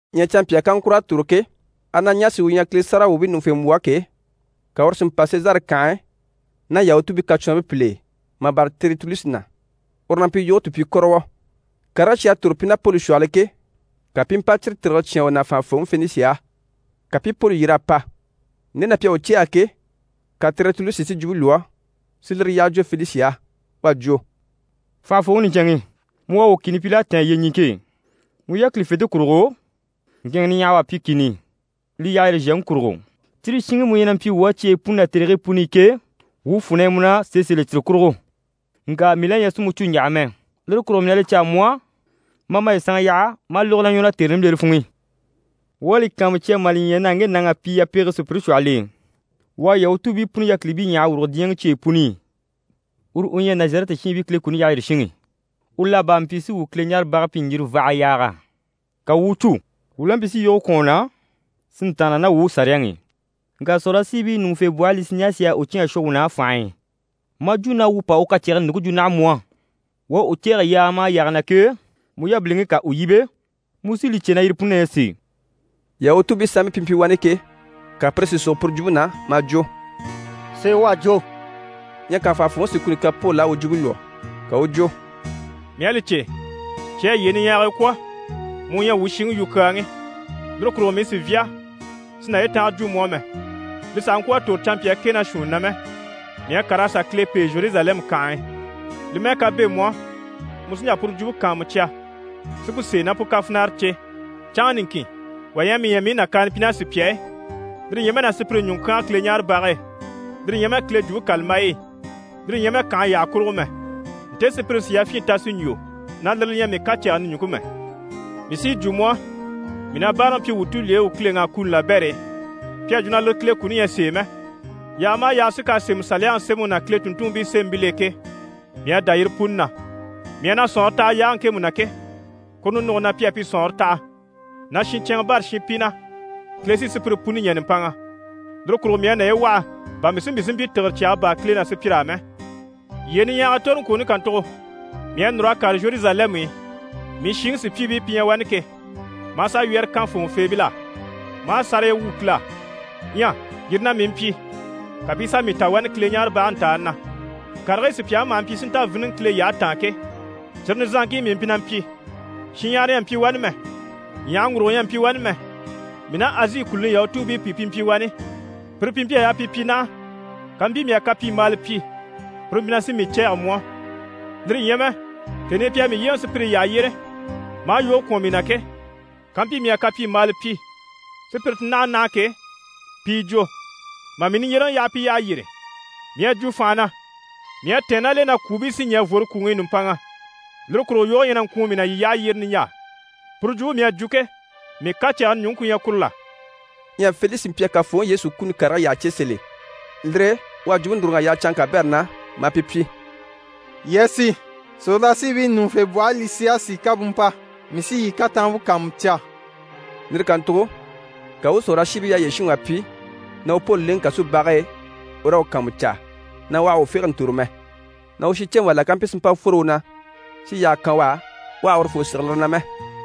Ɲyɛ canmpyaa kaŋkur'à tòro ke, Ananiyasi u ɲyɛ Kile sáragawwuubii ɲùŋufembwɔhe ke, ka uru si mpa Sezare kànhe e ná Yahutuubii kacwɔnribii pìl'e mà bâra Tɛritulusi na, uru na mpyi yoge tùpyikɔrɔwɔ. Karigii cyi à tòro pi ná Poli shwɔhɔl'e ke, ka pi i mpa cyire tìgire cyán u na fànhafooŋi Felisi á. Ka pi i Poli yyer'a pa. Nde na pi à u cɛ̂ɛgɛ ke, ka Tɛritulusi si jwumpe lwɔ́ si lire yyaha jwo Felisi á. U à jwo: «Fànhafooŋi niɲcɛnŋi, mu u à wuu kìni pyi l'à tɛ̀ɛn yyeɲiŋke e. Mu yákilifente kurugo, ŋkɛ̀ɛnŋɛ niɲyahawa à pyi kìni i, li yyaha yyére zhèŋi kurugo. Cyire shiŋi mu ɲyɛ na mpyi wuu á cyeyi puni ná tèrigii puni i ke, wuu fwù na ɲyɛ mu na sèe sèl'e cyire kurugo. Ŋka mii la ɲyɛ sì mu cû ɲjaha mɛ, lire kurugo mii na li caa mu á ma a maye sanŋa yaha ma a lógo wuu ɲwɔ na tère nimbilere funŋ'i. Wuu à li kàanmucya mà li ɲya na ŋge nàŋ'à pyi yapege sùpyire shwɔhɔl'e. U à Yahutuubii puni yákilibii ɲyàha a wùrugo diɲyɛŋi cyeyi puni i. Uru u ɲyɛ Nazarɛti shiinbii Kile kuni yyaha yyére shinŋi. U la bá mpyi si wuu Kileɲaarebage pyi ɲjirivaha yaaga, ka wuu u u cû. [Wuu la mpyi si yoge kwɔ̀n u na, si ntàanna ná wuu Saliyaŋi i, ŋka sòrolashiibii ɲùŋufembwɔhe Lisiyasi à u cyán a shwɔ wuu na fànhe e, maa jwo na wuu pa u kacɛgɛni ɲùŋke jwo naha mu á.] Wuu à u cɛ̂ɛgɛ yaaga maha yaaga na ke, mu yabiliŋi ká u yíbe, mu sí li cè na yire puni na ɲyɛ sèe.» Yahutuubii sanmpii pi mpyi wani ke, ka pire si sogo puru jwumpe na, maa jwo: «Sèe u à jwo!» Ɲyɛ ka fànhafooŋi si kuni kan Poli á u jwumpe lwɔ́. Ka u u jwo: «Mii à li cè, cyi à yyee niɲyahagii kwɔ̀, mu u ɲyɛ wuu shiŋi yukyaalaŋi. Lire kurugo mii sì n‑fyá si naye tànga jwo mu á mɛ. Li sàha ŋkwɔ̀ a tòro canmpyaa kɛ ná shuunni na mɛ, mii à kàr'a sà Kile pêe Zheruzalɛmu kànhe e. Li mɛ́ɛ ká bɛ̂ mu á, mu sí n‑jà puru jwumpe kàanmucya si pu sèe ná pu kafinara cè. Canŋa niŋkin wà ɲyɛ a mii ɲya mii i nàkaana pyi ná sùpya e, lire ɲyɛ mɛ na sùpyire ɲùŋɔ kyánge Kileɲaarebage e, lire ɲyɛ mɛ Kile Jwumpe kàlambayi i, lire ɲyɛ mɛ kànhe yyaha kurugo mɛ. Nte sùpyire sì yafyin ta si ɲjwo na lire li ɲyɛ mii kacɛgɛni ɲùŋke mɛ. Mii sí yi jwo mu á, mii na báaraŋi pyi wuu tulyeyi u Kileŋi á kuni labɛr'e. Pi à jwo na lire Kile kuni ɲyɛ sèe mɛ. Yaaga maha yaaga sí k'à sémɛ Saliyaŋi sémɛŋi ná Kile tùnntunmpii sémɛbil'e ke, mii à dá yire puni na. Mii à na sɔ̀nŋɔre taha yaage ŋkemu na ke, kuru ninuge na pi à pi sɔ̀nŋɔre taha, na shincɛnŋɛ bâra shinpi na, Kile sí sùpyire puni ɲɛ̀ nùmpanŋa. Lire kurugo mii à naye waha bà mii si mpyi si mpyi tìgire cyaga baa Kile ná sùpyir'á mɛ. Yyee niɲyahagii toroŋkwooni kàntugo, mii à núr'a kàre Zheruzalɛmu i, mii shiŋi sùpyiibii pi ɲyɛ wani ke, maa sà wyɛ́rɛ kan fòŋɔfeebil'á, maa sáraya wwû Kile á. Ɲyɛ yire na mii mpyi, ka pi i sà mii ta wani Kileɲaarebage ntàani na. Karigii sùpyaŋi maha mpyi si nta víniŋɛ Kile yyahe taan ke, cyire nizanŋkii mii mpyi na mpyi. Shinɲyahara ɲyɛ a mpyi wani mɛ, ɲyàhaŋgurugo ɲyɛ a mpyi wani mɛ. Mii ná Azi kùluni Yahutuubii pìi pi mpyi wani. Pire pi mpyi a yaa pi pyi naha, kampyi mii à kapyimbaala pyi, pire mpyi na sí mii cɛ̂ɛgɛ mu á. Lire ɲyɛ mɛ, tèni i pi à mii yyéeŋɛ sùpyire yyaha yyére maa yoge kwɔ̀n mii na ke, kampyi mii à kapyimbaala pyi, sùpyire ti naha naha ke, pi yi jwo. Mà mii niɲjyereŋi yaha pi yyaha yyére, mii à jwo fànha na “Mii à tɛ̀ɛn ná l'e na kwùubii sí ɲɛ̀ n‑fworo kwùŋi i nùmpanŋa. Lire kurugo yoge ɲyɛ na ŋkwùun mii na yii yyaha yyére niɲjaa.” Puru jwumpe mii à jwo ke, mii kacɛgɛni ɲùŋke ku ɲyɛ kuru la?» Ɲyɛ Felisi mpyi a Kafooŋi Yesu kuni karigii yyaha cè sèl'e, lire e u à jwumpe núruŋ'a yaha canŋke kabɛrɛ na maa pi pyi: «Yii a sì, sòrolashiibii ɲùŋufembwɔhe Lisiyasi ká bú mpa, mii sí yii kataanmpe kàanmucya.» Lire kàntugo ka u u sòrolashiibii yyaha yyére shinŋi wà pyi na u Poli lèŋɛ kasubage e u raa u kàanmucaa, na u àha u fége n‑tòro mɛ, na u shinceŋi wà la ká mpyi si mpa fworo u na, si yaage kà kan u á, u àha urufoo sige lire na mɛ.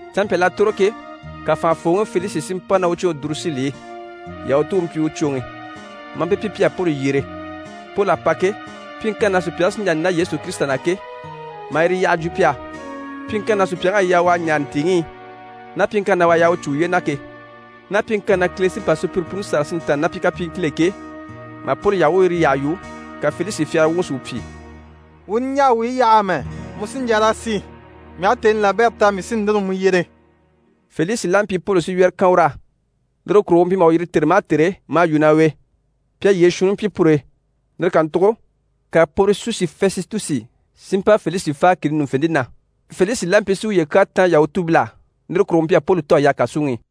Canmpyal'à tòro ke, ka fànhafooŋi Felisi si mpa ná u cwoŋi Durusili i. Yahutu u mpyi u cwoŋi, maa pi pyi pi a sà Poli yyere. Poli a pa ke, pyiŋkanni na sùpyaŋi sí n‑jà n‑dá Yesu Kirisita na ke, maa yire yyaha jwo pi á. Pyiŋkanni na sùpyaŋ'à yaa u a ɲaare ntìiŋi i, ná pyiŋkanni na u à yaa u cû uye na ke, ná pyiŋkanni na Kile sí n‑pa sùpyire puni sâra si ntàanna ná pi kapyiiŋkil'e ke, mà Poli yaha u u yire yyaha yu, ka Felisi fyagara wuŋi si u pyi: «Wuu niɲjaa wuyi yaha amɛ, mu sí n‑jà raa sì, mii aha tèni labɛrɛ ta, mii sí núru mu yyere.» Felisi la mpyi Poli si wyɛ́rɛ kan ur'á, lire kurugo u mpyi maha u yîri tère maha tère maa yu ná u e. Pi a yyee shuunni pyi pur'e, lire kàntugo, ka Pɔrisusi Fɛsitusi si mpa Felisi fáa kìni ɲùŋufente na. Felisi la mpyi si uye kyaa táan Yahutuubil'á, lire kurugo u mpyi a Poli tò a yaha kàsuŋi i.